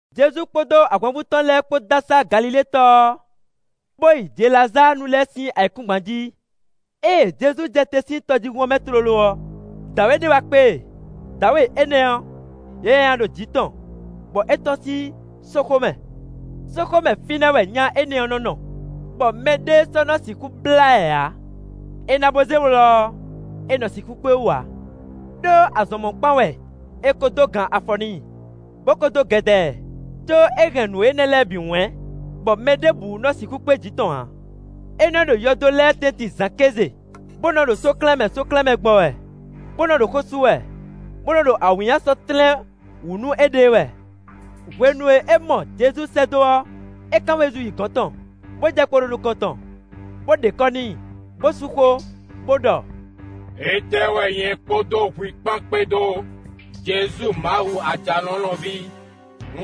Jezu kpódó ahwanvú tɔn lɛ́ɛ kpó dó asá Galilée tɔ ɔ́, bó yi Jelazáanu lɛ́ɛ sín ayǐkúngban jí. Ée Jezu jɛ te sín tɔjíhún ɔ́ mɛ tlóló ɔ́, dǎwe ɖé wá kpé e; dǎwe énɛ́ ɔ́, yɛ nyanya ɖo jǐ tɔn, bɔ é tɔ́n sín sóxo mɛ. Sóxo mɛ fínɛ́ wɛ nya énɛ́ ɔ́ nɔ́ nɔ, bɔ mɛɖé sɔ́ nɔ sixú blá ɛ ǎ; è nǎ bó zé wlɔ ɔ́, è nɔ sixú kpé wú ǎ. Đó azɔn mɔ̌kpán wɛ è ko dó gan afɔ n'i, bó ko dó gɛdɛ ɛ, có é hɛn nǔ énɛ́ lɛ́ɛ bǐ wɛ̌n, bɔ mɛ ɖěbǔ nɔ́ sixú kpé jǐ tɔn ǎ. É nɔ ɖo yɔdo lɛ́ɛ tɛ́ntin zǎn kéze, bó nɔ́ ɖo sóklɛ́nmɛ sóklɛ́nmɛ gbɔn wɛ, bó nɔ́ ɖo xó sú wɛ, bó nɔ́ ɖo awǐnnya sɔ́ tlɛ́n wǔ nú éɖée wɛ. Hwenu e é mɔ Jezu sɛ́ dó ɔ́, é kán wezun yi gɔ̌n tɔn, bó jɛ kpo ɖo nukɔn tɔn, bó ɖe kɔ́ n'i, bó sú xó, bó ɖɔ: “Étɛ́ wɛ nyɛ kpódó hwi kpán kpédó, Jezu Mawu Ajalɔ̌nlɔn ví?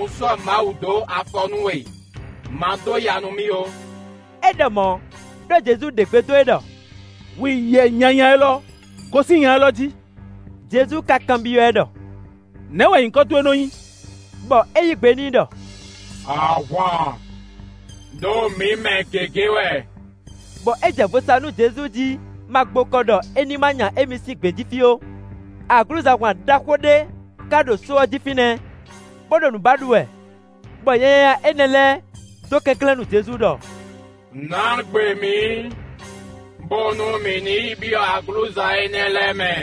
Un sɔ́ Mawu ɖó afɔ nú we, ma dó ya nú mì ó.” (É ɖɔ mɔ̌ ɖó Jezu ɖe gbe dó e ɖɔ: “Hwi yɛ nyanya élɔ́, gosín nya élɔ́ jí!”) Jezu ka kanbyɔ́ ɛ ɖɔ: “Nɛ̌ wɛ nyǐkɔ towe nɔ́ nyí?” Bɔ é yí gbe n'i ɖɔ: “ ‘Ahwan’, ɖó mǐ mɛ gěgé wɛ.” Bɔ é jɛ vo sa nú Jezu jí ma gbokɔ ɖɔ ní ma nya émí sín gbějí fí ó. Aglǔzahwan ɖaxó ɖé ka ɖo só ɔ́ jí fínɛ́, bó ɖo nǔ ba ɖu wɛ. Bɔ yɛ nyanya énɛ́ lɛ́ɛ dó kɛnklɛ́n nú Jezu ɖɔ: “Nǎ gbe mǐ, bónú mǐ ní yi byɔ́ aglǔza énɛ́ lɛ́ɛ mɛ.”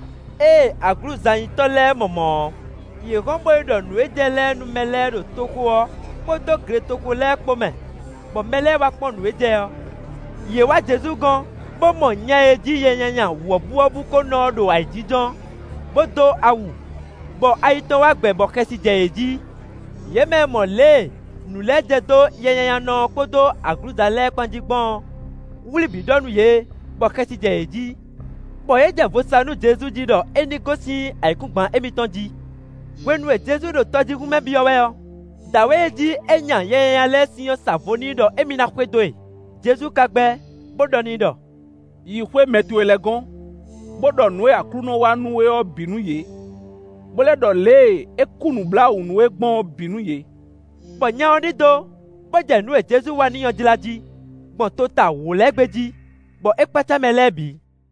Ée aglǔzanyitɔ́ lɛ́ɛ mɔ mɔ̌ ɔ́, yě hɔn bó yi ɖɔ nǔ e jɛ lɛ́ɛ nú mɛ lɛ́ɛ ɖo toxo ɔ́ kpódó gletoxo lɛ́ɛ kpó mɛ, bɔ mɛ lɛ́ɛ wá kpɔ́n nǔ e jɛ ɔ́. Yě wá Jezu gɔ́n, bó mɔ nya e jí yɛ nyanya wɔ̌buwɔ́bú kó nɔ ɔ́, ɖo ayǐjínjɔ́n, bó dó awu, bɔ ayi tɔn wá gbɛ bɔ xɛsi jɛ yě jí. Yě mɛ e mɔ lě e nǔ lɛ́ɛ jɛ dó yɛnyanyanɔ ɔ́ kpódó aglǔza lɛ́ɛ kpán jí gbɔn ɔ́, wlǐ bǐ ɖɔ nú yě, bɔ xɛsi jɛ yě jí. Bɔ yě jɛ vo sa nú Jezu jí ɖɔ é ní gosín ayǐkúngban émítɔn jí. Hwenu e Jezu ɖo tɔjíhún mɛ byɔ́ wɛ ɔ́, dǎwe e jí é nya yɛ nyanya lɛ́ɛ sín ɔ́ sa vo n'i ɖɔ émí ná xwedó e. Jezu ka gbɛ́, bó ɖɔ n'i ɖɔ: “Yi xwé mɛ towe lɛ́ɛ gɔ́n, bó ɖɔ nǔ e Aklúnɔ wa nú we ɔ́ bǐ nú yě, bó lɛ́ ɖɔ lě e é kú nǔbláwǔ nú we gbɔn ɔ́ bǐ nú yě.” Bɔ nya ɔ́ ɖidó, bó jɛ nǔ e Jezu wá n'i ɔ́ jlá jí, gbɔn tota wǒ lɛ́ɛ gbé jí, bɔ é kpácá mɛ lɛ́ɛ bǐ.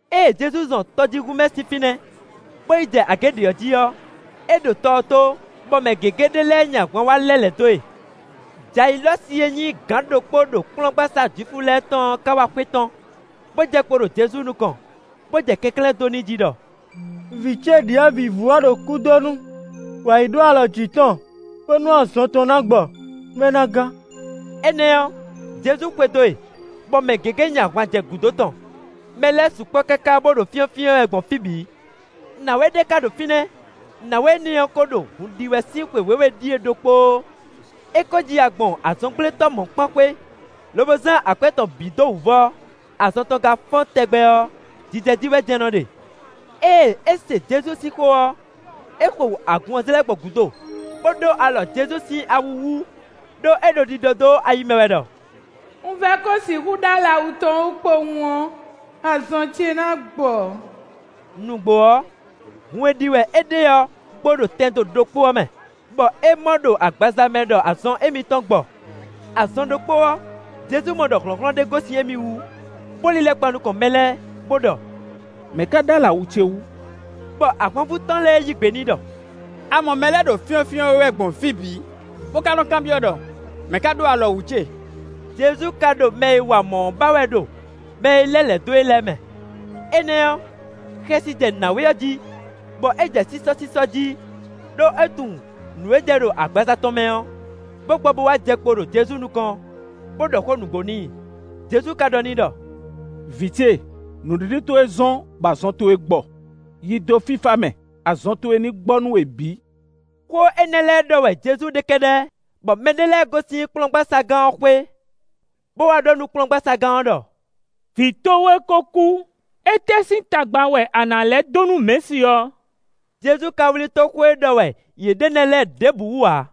Ée Jezu zɔn tɔjíhún mɛ sín fínɛ́, bó yi jɛ agě ɖě ɔ́ jí ɔ́, é ɖo tɔ ɔ́ tó, bɔ mɛ gěgé ɖé lɛ́ɛ nyi ahwan wá lɛ́ lɛ̌ dó e. Jayilɔ́si e nyí gǎn ɖokpó ɖo kplɔ́ngbasá Jwifu lɛ́ɛ tɔn ɔ́ ká wá xwetɔ́n, bó jɛ kpo ɖo Jezu nukɔn, bó jɛ kɛnklɛ́n dó n'i jí ɖɔ: “Vǐ ce ɖyɔ̌vǐvú ɔ́ ɖo kúdonu; wǎ yi ɖó alɔ jǐ tɔn, bónú azɔn tɔn ná gbɔ, nú é ná gán.” Énɛ́ ɔ́, Jezu xwedó e, bɔ mɛ gěgé nyi ahwan jɛ gǔdo tɔn; mɛ lɛ́ɛ sukpɔ́ káká bó ɖo fyɔ́nfyɔ́n ɛ wɛ gbɔn fí bǐ. Nǎwe ɖé ka ɖo fínɛ́; nǎwe énɛ́ ɔ́ kó ɖo hun ɖi wɛ sín xwe wěwe ɖíe ɖokpóó. É kó ji ya gbɔn azɔngblétɔ́ mɔ̌kpán xwé, lobo zán akwɛ́ tɔn bǐ dó wǔvɔ́, azɔn tɔn ka fɔ́n tɛgbɛ ɔ́, jijɛ jí wɛ jɛ́n nɔ́ ɖe. Ée é se Jezu sín xó ɔ́, é xo agun ɔ́ zlɛ́ gbɔn gǔdo, bó ɖó alɔ Jezu sín awu wú; ɖó é ɖo ɖiɖɔ dó ayi mɛ wɛ ɖɔ: “Un vɛ́ ko sixú ɖó alɔ awu tɔn wú kpowun ɔ́, azɔn ce ná gbɔ.” Nǔgbó ɔ́, hun e ɖi wɛ é ɖe ɔ́ gbo ɖo tɛndo ɖokpó ɔ́ mɛ; bɔ é mɔ ɖo agbaza mɛ ɖɔ azɔn émítɔn gbɔ. Azɔn ɖokpó ɔ́, Jezu mɔ ɖɔ hlɔ̌nhlɔ́n ɖé gosín émí wú, bó lílɛ́ kpan nukɔn mɛ lɛ́ɛ, bó ɖɔ: “Mɛ̌ ka ɖó alɔ awu ce wú?” Bɔ ahwanvú tɔn lɛ́ɛ yí gbe n'i ɖɔ: “A mɔ mɛ lɛ́ɛ ɖo fyɔ́nfyɔ́n we wɛ gbɔn fí bǐ, bó ká nɔ́ kanbyɔ́ ɖɔ: ‘Mɛ̌ ka ɖó alɔ wǔ ce?’” Jezu ka ɖo mɛ e wa mɔ̌ ɔ́ ba wɛ ɖo mɛ e lɛ́ lɛ̌ dó e lɛ́ɛ mɛ. Énɛ́ ɔ́, xɛsi jɛ nǎwe ɔ́ jí, bɔ é jɛ sísɔ́sísɔ́ jí; ɖó é tunwun nǔ e jɛ ɖo agbaza tɔn mɛ ɔ́, bó gbɔ bó wá jɛ kpo ɖo Jezu nukɔn, bó ɖɔ xó nǔgbó n'i. Jezu ka ɖɔ n'i ɖɔ: “Vǐ ce, nǔɖiɖi towe zɔ́n, bɔ azɔn towe gbɔ. Yi dó fífá mɛ; azɔn towe ní gbɔ nú we bǐ.” Xó énɛ́ lɛ́ɛ ɖɔ wɛ Jezu ɖe kɛ́ɖɛ́, bɔ mɛɖé lɛ́ɛ gosín kplɔ́ngbaságán ɔ́ xwé, bó wá ɖɔ nú kplɔ́ngbaságán ɔ́ ɖɔ: “Vǐ towe kó kú, étɛ́ sín tagba wɛ a nǎ lɛ́ dó nú mɛ̌si ɔ́?” Jezu ka wlí tó xó e ɖɔ wɛ yě ɖe nɛ́ lɛ́ɛ ɖěbǔ wú ǎ,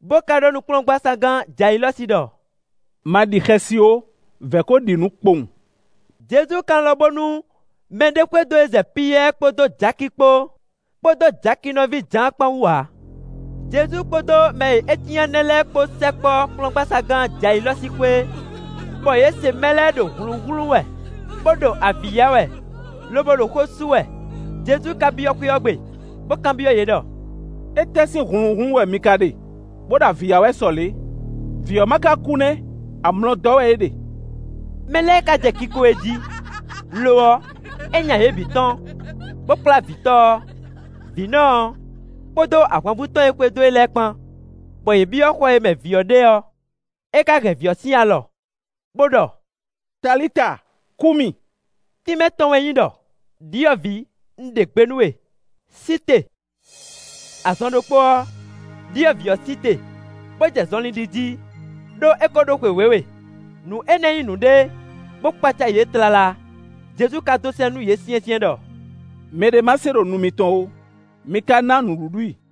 bó ká ɖɔ nú kplɔ́ngbaságán Jayilɔ́si ɖɔ: “Ma ɖi xɛsi ó, vɛ̌ kó ɖi nǔ kpowun.” Jezu ka lɔn bónú mɛɖé xwedó e zɛ Piyɛ́ɛ kpódó Jaki kpó, kpódó Jaki nɔví Jǎan kpán wú ǎ. Jezu kpódó mɛ e é cyán nɛ́ lɛ́ɛ kpó sɛkpɔ́ kplɔ́ngbaságán Jayilɔ́si xwé, bɔ yě se mɛ lɛ́ɛ ɖo hlǔnhlún wɛ, bó ɖo avǐ ya wɛ, lobo ɖo xó sú wɛ. Jezu ka byɔ́ xwé ɔ́ gbe, bó kanbyɔ́ yě ɖɔ: “Étɛ́ sín hlǔnhlún wɛ mi ka ɖe, bó ɖo avǐ ya wɛ sɔ lě? Vǐ ɔ́ ma ká kú nɛ́! Amlɔ dɔ́ wɛ é ɖe.” Mɛ lɛ́ɛ ka jɛ kiko e jí; lo ɔ́, é nya yě bǐ tɔ́n, bó kplá vǐtɔ́ ɔ́, vǐnɔ ɔ́, kpódó ahwanvú tɔn e xwedó e lɛ́ɛ kpán, bɔ yě byɔ́ xɔ e mɛ vǐ ɔ́ ɖe ɔ́; é ká hɛn vǐ ɔ́ sín alɔ, bó ɖɔ: “Talita, kúmi.” (Tínmɛ tɔn wɛ nyí ɖɔ: “Đyɔ̌vǐ un ɖe gbe nú we; sí te.”) Azɔn ɖokpó ɔ́, ɖyɔ̌vǐ ɔ́ sí te, bó jɛ zɔnlin ɖi jí, (ɖó é ko ɖó xwe wěwe.) Nǔ énɛ́ nyí nǔɖé, bó kpácá yě tlala. Jezu ka dó sɛ́n nú yě syɛ́nsyɛ́n ɖɔ: “Mɛ ɖé ma se ɖo nu mitɔn ó, mi ka ná nǔɖuɖu i.”